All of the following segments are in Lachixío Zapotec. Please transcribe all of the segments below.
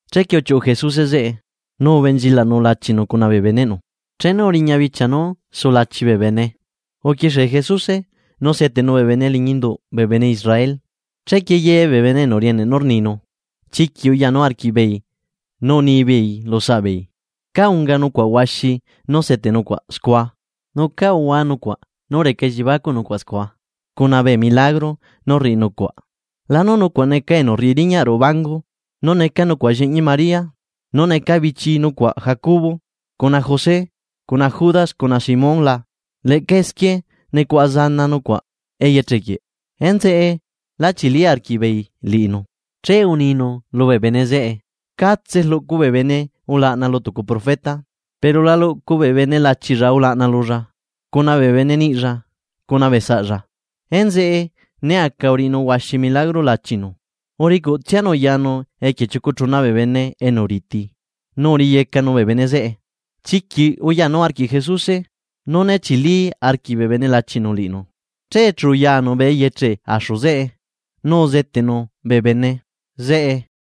Chequie uchiuꞌu Jesuse zeꞌe, nu ubenchilaꞌnu lachinu cuna bee beneꞌnu. Chenu uriña bichia nú sulachi bee bene uquixie Jesuse nú seteꞌnu bee bene liñi induꞌ bee bene Israel, che ye bee bene enu rieneꞌ nú rninu, chiquiꞌ uyanu arquiꞌbeei nu unibeei lu saꞌbeei: ―¿Cá unga nucuaꞌ huaxi nú seteꞌ nucuaꞌ scua? ¿Nu cá uhua nucuaꞌ nú reca elliebacuꞌ nucuaꞌ scua cuna bee milagro nú rriꞌi nucuaꞌ? ¿La nu nucuaꞌ neca enu rriꞌi riñaꞌ ruꞌu bangu nu neca nucuaꞌ llianaꞌ María, nu neca bichi nucuaꞌ Jacobo, cuna José, cuna Judas cuna Simón la? ¿Leꞌca esquie nucuaꞌa bee zana nucuaꞌ eyeche quieꞌ? Enzeꞌe lá chili arquiꞌbeei liꞌinu. Che uninu lubee bene zeꞌe: ―Catse rluꞌcu bee bene ulaꞌna lu tucu profeta. Pero la luꞌcu bee bene lachilla ulaꞌna lulla, cuna bee bene niꞌilla cuna bee saꞌlla. Enzeꞌe né aca a riꞌinu huaxi milagro lachinu uricuꞌtsianu yanu equie chiucu chuna bee bene enu riti nu uriꞌiyecanu bee bene zeꞌe. Chiquiꞌ uyanu arquiꞌ Jesuse, nú né chili arquiꞌ bee bene lachinu liꞌinu. Che chu uyanu bee eyeche axu zeꞌe nu uzeteꞌnu bee bene zeꞌe.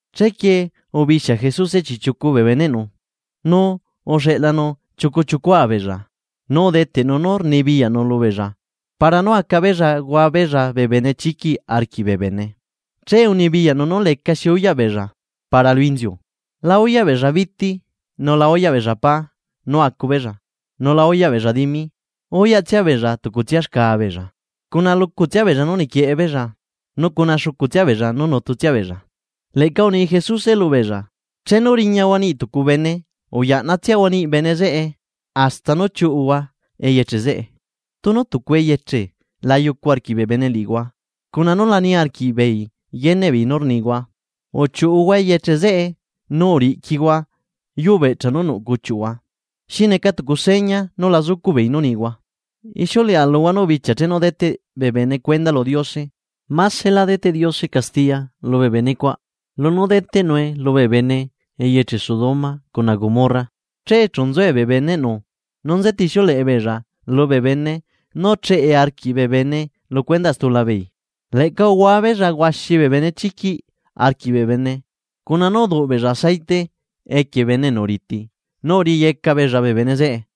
Chequie ubixia Jesuse chiꞌchiucu bee beneꞌnu, nu uxeꞌlanu chiucua chiucua beella. Nu udeteꞌnu poder lubeella para nú aca beella hua beella bee benechiquiꞌ arquiꞌ bee bene. Che unibiyaꞌnu nú lecaxi uyaꞌ beella para lu inziu, la uyaꞌ beella biti nu la uyaꞌ beella pá nú acu beella nu la uyaꞌ beella dimi, uyaꞌtsia beella tucutsia xca beella. Cuna lucutsia beella nú niquieꞌe beella nu cuna xucu beella nú nutu tsia beella. Leꞌca uni Jesuse lubeella: ―Chenu riñahua niꞌi tucu bene uyaꞌnatsiahua niꞌi bene zeꞌe hasta nú chiuꞌuhua eyeche zeꞌe. Tunu tucu eyeche la yucu arquiꞌ bee bene liꞌihua cuna nú la niarquiꞌbeei yeneꞌ beei nú rnihua, uchiuꞌuhua eyeche zeꞌe nu riꞌquihua yuu beꞌchaꞌ nú nuꞌ cuchiuꞌhua, xi neca tucu seña nú lá zucuꞌbeei nú unihua. Ixiuleꞌa luhua nú bichia chenu deteꞌ bee bene cuenda lu Diose másela deteꞌ Diose castiya lubee bene cuaꞌ lunú deteꞌnue lubee bene eyeche Sodoma cuna Gomorra. Che chu nzue bee beneꞌnu nu nzetixiuleꞌe beella lubee bene nú cheꞌe arquiꞌ bee bene lu cuendaꞌ stulabeei. Leꞌca uhua beella huaxi bee benechiquiꞌ arquiꞌ bee bene cuna nú uduꞌ beella aceite equie bee bene enu riti nu uriꞌiyeca beella bee bene zeꞌe.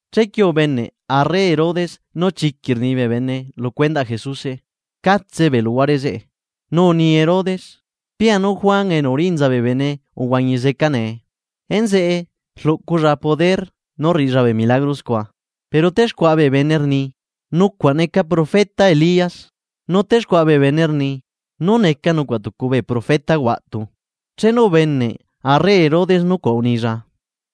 Chequie ubeneꞌ arre Herodes nú chiquiꞌ rni bee bene lu cuendaꞌ Jesuse, catse bee luhuare zeꞌe. Nu uni Herodes: ―Pia nú Juan Bautista uhuañi zeca nee, enzeꞌe rluꞌculla poder nú rriꞌilla bee milagro scua. Pero texcuaꞌa bee bene rni: ―Neca nucuaꞌ profeta Elías. Nu texcuaꞌa bee bene rni: ―Neca nucuaꞌ tucu bee profeta huaꞌtu. Chenu ubeneꞌ arre Herodes nucuaꞌ unilla: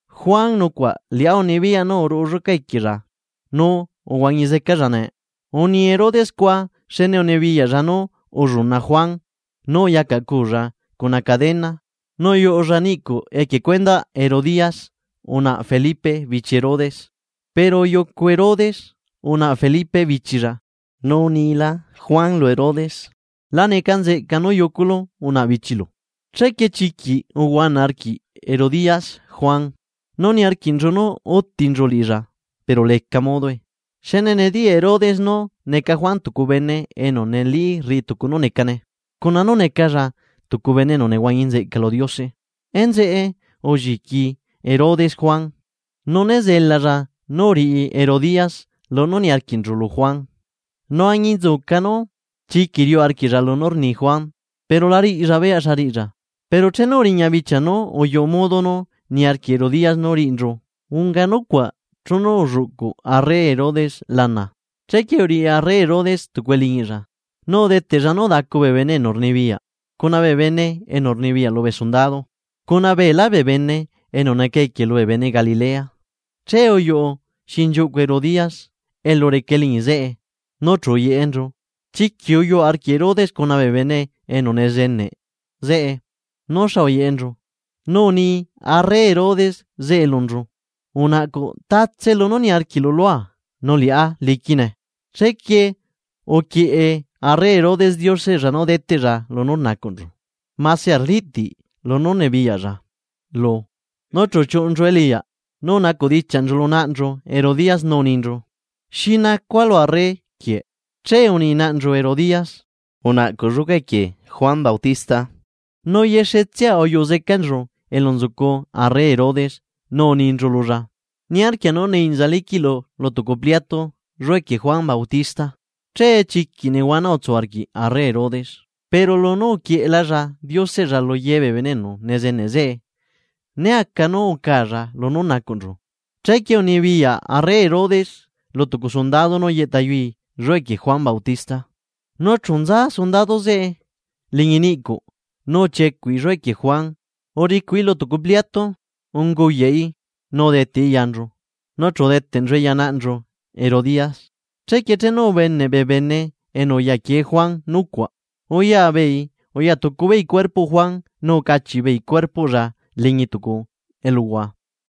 ―Juan Bautista nucuaꞌ liꞌá unibiyaꞌa nú uruꞌu lluca equiella nu uhuañi zecalla nee. Uni Herodes scua xne unibiyaꞌlla nú ulluna Juan nu uyacaꞌcuulla cuna cadena nu uyuꞌulla niꞌcuꞌ equie cuendaꞌ Herodías unaꞌa Felipe bichi Herodes. Pero uyucu Herodes unaꞌa Felipe bichilla. Nu unilá Juan lu Herodes: ―La neca nzeꞌca nú yuculu unaꞌa bichilu. Chequie chiquiꞌ uhuana arquiꞌ Herodías Juan, nu niarquiꞌnchu nú útinchu liꞌilla pero leca modoe. Xne nediyaꞌ Herodes nú neca Juan tucu bene enu neli rriꞌi tucu nú necane cuna nú necalla tucu bene enu nehuañi nzeꞌca lu Diose, enzeꞌe ulliqui Herodes Juan. Nu né zelalla nú riꞌi Herodías lunú niarquiꞌnchu lu Juan, nu añinzuca nú chiquiꞌ riuꞌ arquiꞌlla lunú rni Juan pero la riꞌilla beyaꞌ xa riꞌilla. Pero chenu uriña bichia nú uyuꞌu modo nú niarquiꞌ Herodías nú riꞌinchu, unga nucuaꞌ chenu ulluꞌcu arre Herodes lana, chequie uriꞌi arre Herodes tucu eliñiꞌlla nu udeteꞌlla nú udacu bee bene enu rnibiyaꞌ cuna bee bene enu rnibiyaꞌ lubee sundado, cuna beelá bee bene enu neca equie lubee bene Galilea. Che uyuꞌu xinchiuꞌcu Herodías elu reca eliñi zeꞌe nu chu uyeꞌenchu. Chiquiꞌ uyuꞌ arquiꞌ Herodes cuna bee bene enu nezeneꞌ zeꞌe nú xa uyeꞌenchu nu uni arre Herodes zeꞌe lunchu: ―Unaꞌcuꞌ tatse lunú niarquiꞌlu lua, nu liꞌá liquine. Chequie uquieꞌe arre Herodes dioseꞌlla nú deteꞌlla lunchu lunú nacuꞌnchu mase arliꞌti lunú rnibiyaꞌlla lu. Nu chu uchiuꞌunchu eliꞌyaꞌ nu unidichiaꞌnchu lu naꞌnchu Herodías nú uninchu: ―¿Xi nacua lu arre quieꞌ? Che uni naꞌnchu Herodías: ―Unaꞌcuꞌ lluca equie Juan Bautista. Nu yexetsia uyuꞌu zecanchu elu nzucu arre Herodes nu uninchu lulla: ―Niarquia nú nee inza liquiꞌlu lu tucu pliatu lluca equie Juan Bautista. Che chiquiꞌ nehuana utsu arquiꞌ arre Herodes. Pero lu nú uquieꞌelalla dioseꞌlla lu ye bee bene enu nezeneꞌ zeꞌe, lecaꞌ modo nú acaalla lunú unacuꞌnchu. Chequie unibiyaꞌ arre Herodes lu tucu sundado nú yeꞌtayui lluca equie Juan Bautista. Nu chu nza sundado zeꞌe liñi niꞌcuꞌ nu uchiecuꞌi lluca equie Juan uricuꞌi lu tucu pliatu nu unguyaꞌi nu udeteꞌi yanchu nu chu udeteꞌnchue ya naꞌnchu Herodías. Chequie chenu ubeneꞌ bee bene enu uyaquie Juan nucuaꞌ, uya beei uya tucu beei cuerpoꞌ Juan nu ucachiꞌ beei cuerpoꞌlla liñi tucu eluhua.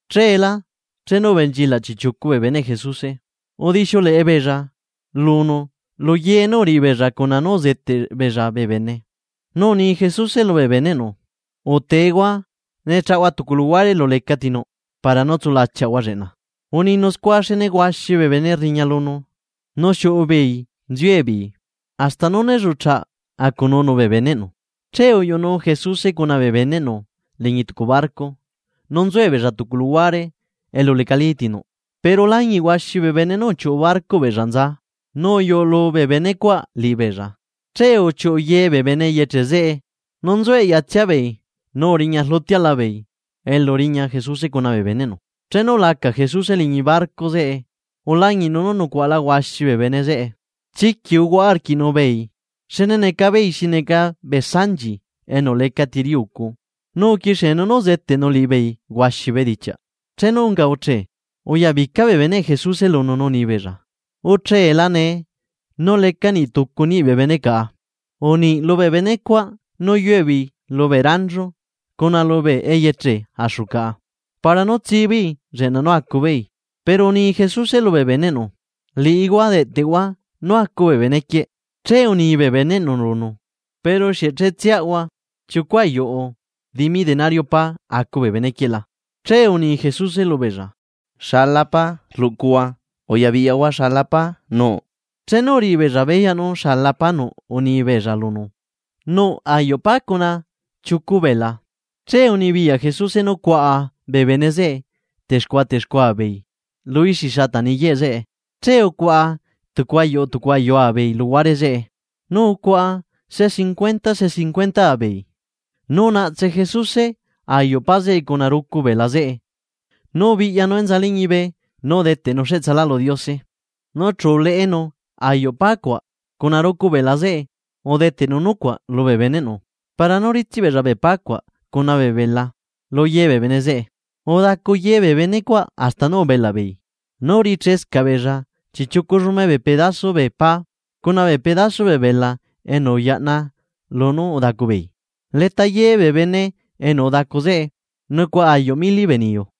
Cheelá chenu ubenchilaꞌ chiꞌchiucu bee beneꞌ Jesuse, udixiuleꞌe beella lunu lu ye nú uriꞌi beella cuna nú uzeteꞌ beella bee bene. Nu uni Jesuse lubee beneꞌnu: ―Uteehua, ne chaꞌahua tucu luhuare elu lecati nuꞌ para nú tsulachiaꞌahua zeꞌe lleꞌna. Uninu scua xne huaxi bee bene rriña lunu nu xiuꞌu beei nziue beei hasta nú né lluꞌcha acununu bee beneꞌnu. Che uyuꞌu Jesuse cuna bee beneꞌnu liñi tucu barco nu nzuebeella tucu luhuare elu lecalí ti nuꞌ. Pero ulañiꞌ huaxi bee bene nú uchiuꞌu barcoꞌ beella nza nu uyuꞌulu bee bene cuaꞌ liꞌibeella. Che uchiuꞌu ye bee bene eyeche zeꞌe nu nzue eꞌya tsia beei nu uriña rlutiaꞌla beei elu riña Jesuse cuna bee beneꞌnu. Chenu ulaca Jesuse liñi barco zeꞌe ulañiꞌnu nú nucuaꞌala huaxi bee bene zeꞌe. Chiquiꞌ uhuaꞌa arquiꞌnu liꞌibeei xne neca beei xi neca bee sanchi enu lecati riꞌi ucu nu uquixienu nú uzeteꞌnu liꞌibeei huaxi bee bedichiaꞌ. Chenu unga uchee, uyabica bee beneꞌ Jesuse lunu nu uni beella: ―Ucheela nee, nu leca niꞌtucu niꞌ bee bene caꞌa. Uniꞌi lubee benecuaꞌ nú yue beei lubee ranchu cuna lubee eyeche axu caꞌa, para nú tsii beei lleꞌna nú acubeei. Pero uni Jesuse lubee beneꞌnu: ―Liꞌihua deꞌtehua nú acu bee bene quieꞌ Che uni bee beneꞌnu lunu: ―¿Pero xieꞌ che tsiaꞌhua chiucu ayuꞌu dimi denario pá, acu bee bene quieꞌ la? Chequie uni Jesuse lubeella: ―¿Xala pá rluꞌcuhua? Uya biꞌyahua xala pá nuꞌ. Chenu uriꞌi beella beyaꞌ nú xala pá nuꞌ uni beella lunu: ―Nuꞌ ayuꞌ pá cuna chiucu bela. Che unibiyaꞌ Jesuse nú cuaꞌa bee bene zeꞌe texcuaꞌa texcuaꞌa beei lu ixi xata niyeꞌe zeꞌe. Chequie ucuaꞌa tucu ayua tucu ayua beei luhuare zeꞌe nu ucuaꞌa se cincuentaa se cincuentaa beei. Nu unaꞌtse Jesuse ayuꞌ pá zeꞌe cuna rucu bela zeꞌe nu ubiꞌyanu enza liñibe nu udeteꞌnu cheꞌtsala lu Diose, nu chu uleꞌenu ayuꞌ pá zeꞌe cuna rucu bela zeꞌe udeteꞌnu ya bee beneꞌnu para nú ritsiꞌ beella bee pá cuaꞌ cuna bee bela lu ye bee bene zeꞌe. Udacu ye bee benecuaꞌ hasta nú ubelaꞌ beei. Nu urichescaꞌ beella chiꞌchiucu llume bee pedaso bee pá cuna bee pedaso bee bela enu uyaꞌna lunú udacu beei. Leta ye bee bene enu udacu zeꞌe nucuaꞌa ayuꞌ mili bee niyu.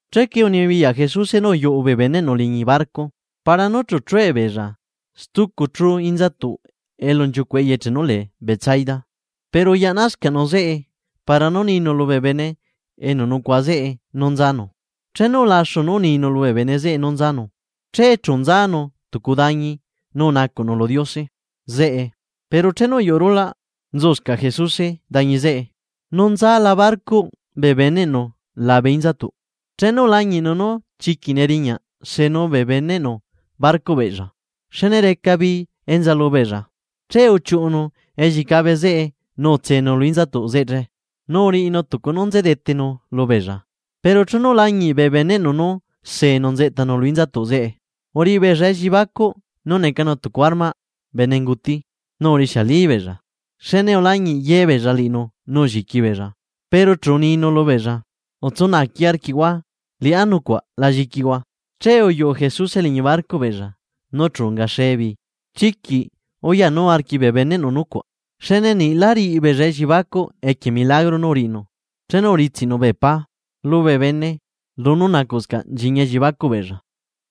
Chequie unibiyaꞌ Jesuse nú uyuꞌu bee beneꞌnu liñi barco para nú chu chue beella stucu chú inzatuꞌ elu nchiucuꞌ eyeche nú lee Betsaida. Pero uyaꞌnascaꞌnu zeꞌe para nú ninu lubee bene enu nucuaꞌa zeꞌe nú nzanu. Chenu ulaxu nú uninu lubee bene zeꞌe nú nzanu, che chu nzanu tucu dañi nu unacuꞌnu lu Diose zeꞌe. Pero chenu uyuꞌu rulaꞌ, nzuscaꞌ Jesuse dañi zeꞌe. Nu nzala barcoꞌ bee beneꞌnu labe inzatuꞌ, chenu ulañiꞌnu nú chiquiꞌ neriñaꞌ tsenuu bee beneꞌnu barcoꞌ beella xne reca bii enza lubeella. Che uchiuꞌunu ellicabe zeꞌe nu utsenu lu inzatuꞌ zeꞌe, nu uriꞌinu tucu nú nze detenu lubeella. Pero chenu ulañiꞌ bee beneꞌnu nú seenu nzeꞌtanu lu inzatuꞌ zeꞌe, uriꞌi beella elliebacuꞌ nú necanu tucu armaꞌ bene unguti nu urixialibeella. Xne ulañiꞌ ye beella liꞌinu nu ulliqui beella, pero chu uninu lubeella: ―¡Utsu naaqui arquiꞌhua liꞌá nucuaꞌ la lliquihua! Che uyuꞌu Jesuse liñi barcoꞌ beella nu chu ungaxee bii. Chiquiꞌ uyanu arquiꞌ bee beneꞌnu nucuaꞌ. Xne niꞌlá riꞌi beella elliebacuꞌ equie milagro nú uriꞌinu chenu uritsiꞌnu bee pá lubee bene lunú nacuꞌscaꞌ nchiñi elliebacuꞌ beella.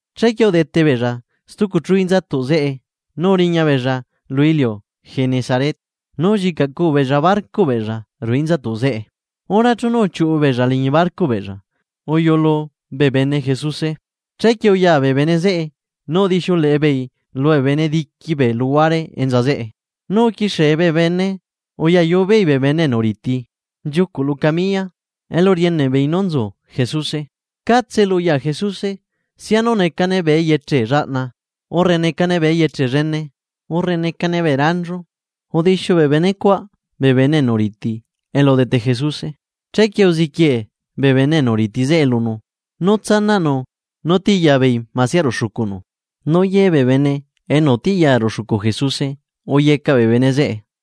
Chequie udete beella stucu chú inzatuꞌ zeꞌe nu uriña beella lu iliu Genezaret nu ullicaꞌcuu beella barcoꞌ beella ruꞌu inzatuꞌ zeꞌe. Hora chenu uchiuꞌu beella liñi barcoꞌ beella uyuꞌulu bee bene Jesuse. Che uya bee bene zeꞌe nu udixiuleꞌe beei lubee bene diqui bee luhuare enza zeꞌe, nu uquixie bee bene uyayu bee bene, bene enu riti nchiucuꞌ lu camiya elu rieneꞌ beei nú nzu Jesuse. Catse elu uya Jesuse sianu necane bee eyeche llaꞌna urre necane bee eyeche llene urre necane bee ranchu udixiu bee bene cuaꞌ bee bene enu riti elu udete Jesuse. Chequie uziquie bee bene enu riti zeꞌe lunu nú zelanu nú tiꞌyabeei masia ruꞌu xucunu; nu ye bee bene enu utiꞌya ruꞌu xucu Jesuse uyecaꞌ bee bene zeꞌe.